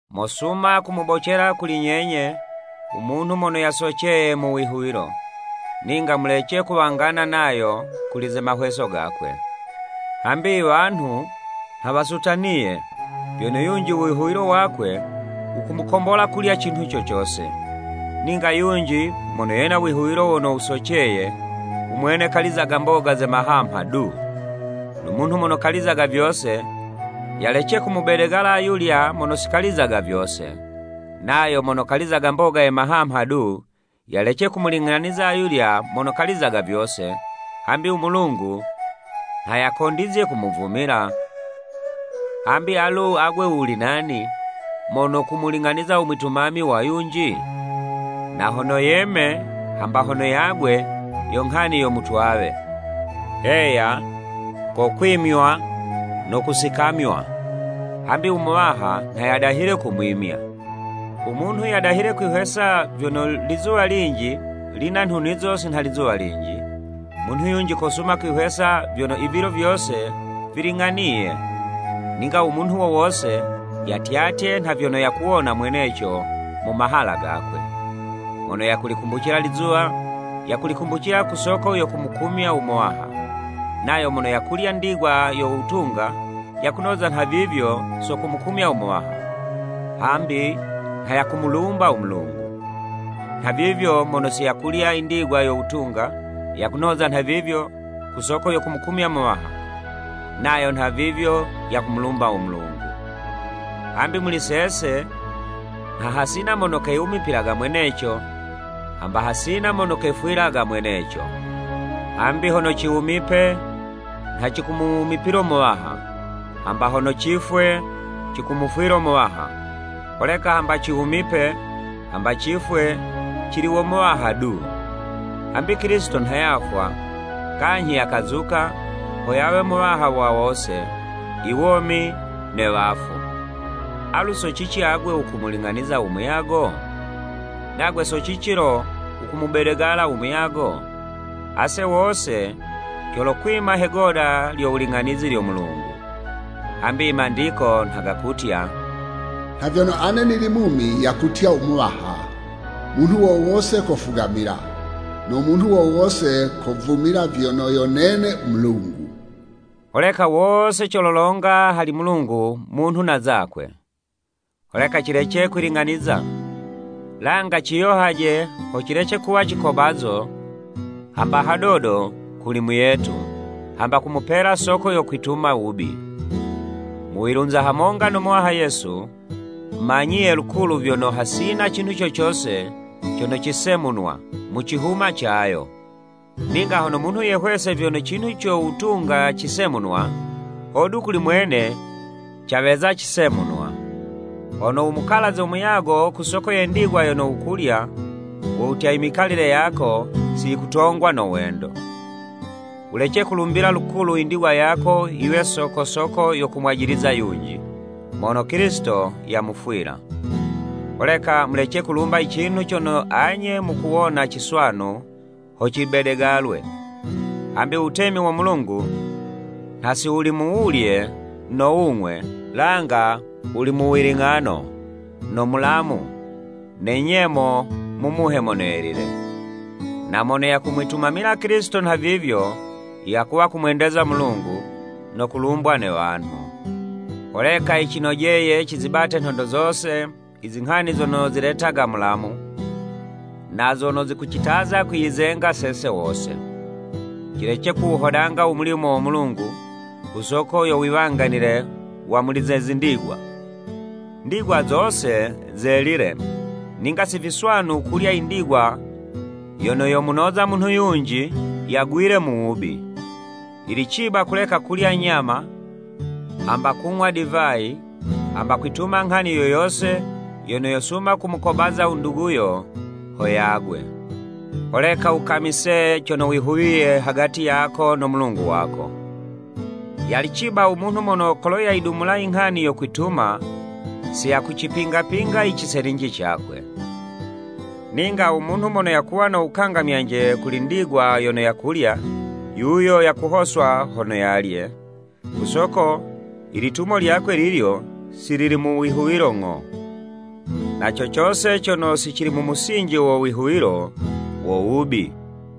Mosuma kumubocela kuli nyenye, u munhu mono yasoceye mu wihuwilo, ninga mulece kuwangana nayo kuli ze mahweso gakwe. Hambi i wanhu nha wasutaniye, vyono yunji u wihuwilo wakwe, wakumukombola kulya cinhu co cose, ninga yunji mono yena u wihuwilo wono wusoceye, u mwene kalizaga mboga ze mahamha du. No munhu mono kalizaga vyose, yalece kumubedegala ayulya mono si kalizaga vyose, nayo mono kalizaga mboga ye mahamha du, yalece kumuling'aniza ayulya mono kalizaga vyose, hambi u Mulungu nha yakondizye kumuvumila. Hambi alu agwe wuli nani, mono kumuling'aniza u mwitumami wa yunji? Na hono yeme hamba hono yagwe, yo nghani yo Mutwawe, heya, kokwimywa no kusikamywa, hambi u Muwaha nha yadahile kumwimya. U munhu yadahile kwihwesa vyono lizuwa linji lina nhunizo si nha lizuwa linji, munhu yunji kosuma kwihwesa vyono ivilo vyose viling'aniye. Ninga u munhu wo wose yatyatye nha vyono yakuwona mweneco mu mahala gakwe. Mono yakulikumbucila lizuwa, yakulikumbucila ku soko yo kumukumya u Muwaha, nayo mono yakulya ndigwa yo wutunga, yakunoza nhavivyo so kumukumya u Muwaha, hambi nha yakumulumba u Mulungu. Nhavivyo mono si yakulya indigwa yo wutunga, yakunoza nhavivyo ku soko yo kumukumya Muwaha, nayo nhavivyo yakumulumba u Mulungu. Hambi muli sese, nha hasina mono keyiwumipilaga mweneco, hamba hasina mono keyifwilaga mweneco, Hambi hono ciwumipe, nha cikumuwumipilo Muwaha, hamba hono cifwe, cikumufwilo Muwaha, holeka hamba ciwumipe, hamba cifwe, cili wo Muwaha du. Hambi Kilisito nha yafwa, kanyhi yakazuka, ho yawe Muwaha wa wose, iwomi ne wafu. Alu so cici agwe wukumuling'aniza u muyago? Nagwe so cici lo wukumubedegala u muyago? Ase wose colokwima he 'goda lyo wuling'anizi lyo Mulungu. Hambi i Mandiko nha gakutya, “Nha vyono ane nili mumi yakutya u Muwaha, munhu wo wose kofugamila, no munhu wo wose kovumila vyono yo nene u Mulungu.” Holeka wose cololonga hali Mulungu munhu na zakwe. Holeka cilece kwiling'aniza, langa ciyohaje ho cilece kuwa cikobazo hamba hadodo kuli muyetu, hamba kumupela soko yo kwituma wubi. Mu wilunza hamonga no Muwaha Yesu, manyiye lukulu vyono, hasina cinhu cocose cono cisemunwa mu cihuma cayo, ninga hono munhu yehwese vyono cinhu co wutunga cisemunwa, hodu kuli mwene caweza cisemunwa. Hono wumukalaze u muyago ku soko ye ndigwa yono wukulya, wo wutya imikalile yako si yikutongwa no wendo. Wulece kulumbila lukulu i ndigwa yako yiwe sokosoko yo kumwajiliza yunji, mono Kilisito yamufwila. Holeka mulece kulumba i cinhu cono anye mukuwona ciswanu ho cibedegalwe. Hambi wutemi wo Mulungu nha si wuli mu wulye no wung'we, langa wuli mu wiling'ano, no mulamu, ne nyemo mu Muhe Mono Yelile. Na mono yakumwitumamila Kilisito nhavivyo, yakuwa kumwendeza u Mulungu, no kulumbwa ne wanhu. Holeka yicinojeye cizibate nhondo zose izinghani zono ziletaga mulamu, na zono zikucitaza kwiyizenga sese wose. Cilece kuwuhodanga u mulimo wo Mulungu, ku soko yo wiwanganile wa muli ze zindigwa. Ndigwa zose zelile, ninga si viswanu kulya indigwa yono yomunoza munhu yunji yagwile mu wubi. Yili ciba kuleka kulya nyama, hamba kung'wa divayi, hamba kwituma nghani yo yose yono yosuma kumukobaza u nduguyo ho yagwe. Holeka wukamise cono wihuwiye hagati yako no Mulungu wako. Yali ciba u munhu mono kolo yayidumula inghani yo kwituma, si yakucipingapinga iciselinji cakwe. Ninga u munhu mono yakuwa no wukangamyanje kuli ndigwa yono yakulya, yuyo yakuhoswa hono yalye, ku soko ilitumo lyakwe lilyo, si lili mu wihuwilo ng'o. Na co cose cono si cili mu musinji wo wihuwilo, wo wubi.